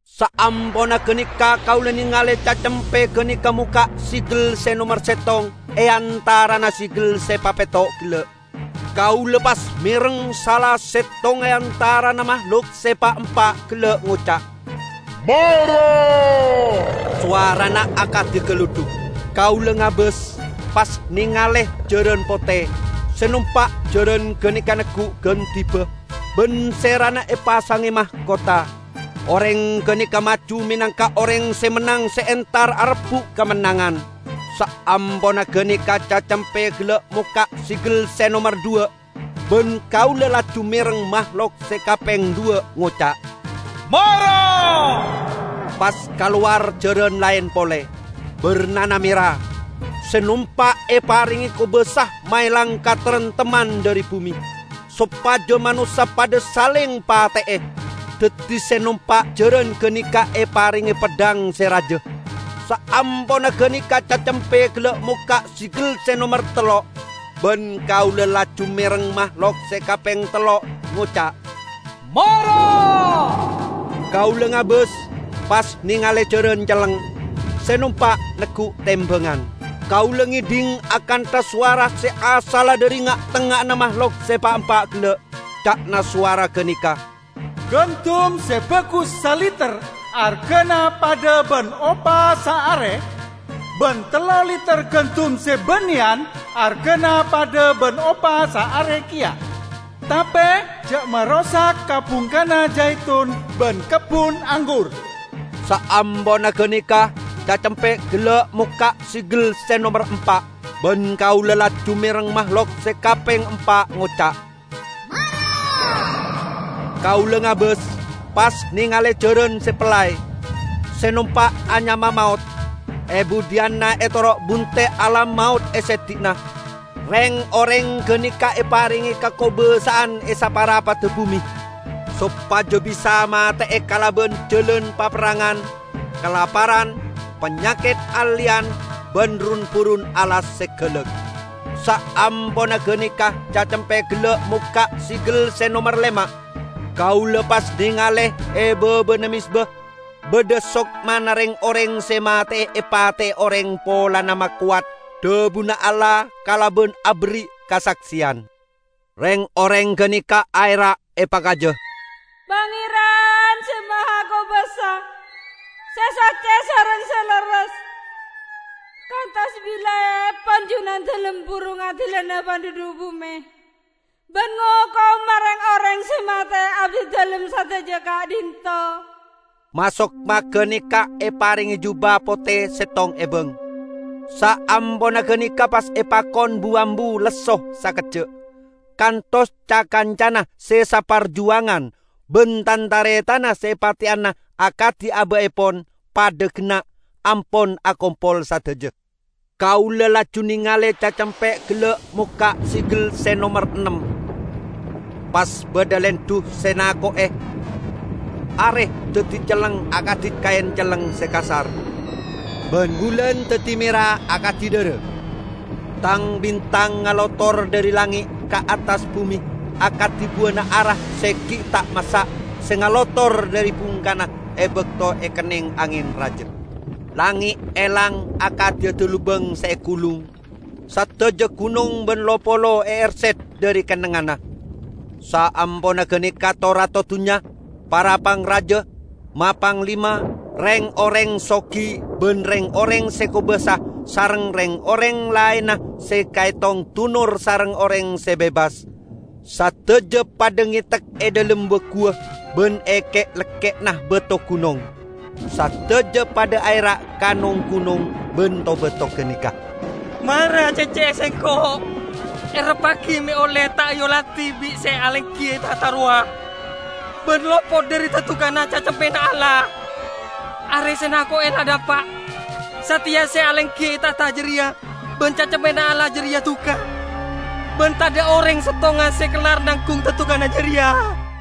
Saamponna ganeka kaula nengale Cacempe ganeka mokka' segel se nomer settong e antarana segel se papetto' gella'. Kaula pas mereng sala settong e antarana mahlok se pa'-empa' gella' ngoca', "Mara!" Sowarana akadi galudhuk. Kaula ngabas, pas nengale jaran pote. Se nompa' jaran ganeka neggu' gandhiba, ban serana epasange makotha. Oreng ganeka maju menangka oreng se mennang se entar arebbu' kamennangan. Saamponna ganeka Cacempe gella' mokka' segel se nomer dhuwa', ban kaula laju mereng mahlok se kapeng dhuwa' ngoca', "Mara!" Pas kalowar jaran laen pole; barnana mera. Se nompa' eparenge kobasa maelang kataremtemman dhari bume, sopaja manossa padha saleng pate'e. Daddi se nompa' jaran ganeka eparenge peddhang se raja. Saamponna ganeka Cacempe gella' mokka' segel se nomer tello'. Ban kaula laju mereng mahlok se kapeng tello' ngoca', "Mara!" Kaula ngabas, pas nengale jaran celleng. Se nompa' neggu' tembangan. Kaula ngedhing akantha sowara se asalla dhari nga'-tengnga'anna mahlok se pa'-empa' gella'. Ca'na sowara ganeka, "Gandum se bagus saliter argana padha ban opa saare, ban tello liter gandum se banneyan argana padha ban opa saare keya. Tape ja' marosak ka-bungkana jaitun ban kebbun anggur!" Saamponna ganeka Cacempe gella' mokka' segel se nomer empa'. Ban kaula laju mereng mahlok se kapeng empa' ngoca', "Mara!" Kaula ngabas, pas nengale jaran se pellay. Se nompa' anyama Maot. E budhiyanna etoro' bunte' Alam Maot e seddi'na. Reng-oreng ganeka eparenge kakobasa'an e saparapadda bume, sopaja bisa mate'e kalaban jalan paperrangan, kalaparan, panyaket alleyan ban run-burun alas se galak. Saamponna ganeka Cacempe gella' mokka' segel se nomer lema'. Kaula pas nengale e babana mezba badha sokmana reng-oreng se mate epate'e oreng polana makowat dhabuna Allah kalaban aberri' kasakseyan. Reng-oreng ganeka aera' epakaja, "Pangeran Se Mahakobasa, se socce sareng se lerres! Kantos bilaepon Junandalem buru ngadilana pandhudhu' bume ban ngokoma reng-oreng se mate'e abdidalem sadaja ka'dhinto'?" Ma-sokma ganeka eparenge juba pote settong ebang. Saamponna ganeka pas epakon bu-ambu lesso sakejja', kantos ca-kancana se saparjuwangan ban tan-taretanna se epateyana akadi aba'epon padha genna' ampon akompol sadaja. Kaula laju nengale Cacempe gella' mokka' segel se nomer ennem. Pas badha lendhu se nako'e. Are daddi celleng akadi kaen celleng se kasar, ban bulan daddi mera akadi dhara. Tang-bintang ngalotor dhari langnge' ka attas bume akadi buwana ara se gi' ta' massa' se ngalotor dhari bungkana e bakto ekenneng angen raja. Langnge' elang akadi dalubang se egulung, sadajana gunong ban lo-polo eerset dhari kennengnganna. Saamponna ganeka to-rato dunnya, para pangraja, ma-panglima, reng-oreng sogi ban reng-oreng se kobasa sareng reng-oreng laenna se kaetong dunor sareng oreng se bebas, sadaja padha ngetek e dhalem wa-guwa ban e ke'-lekke'na bato gunong. Sadaja padha aera' ka nong-gunong ban to-bato ganeka, "Mara cecce'e sengko', erreppagi me' olle ta' eoladi bi' se alenggi e tahta rowa, ban lopot dhari dadukanna Cacempena Allah! Are se nako'e la napa'; sateya se alenggi e tahta jareya ban Cacempena Allah jareya duka, ban tadha' oreng settonga se kellar nanggung dadukan jareya!"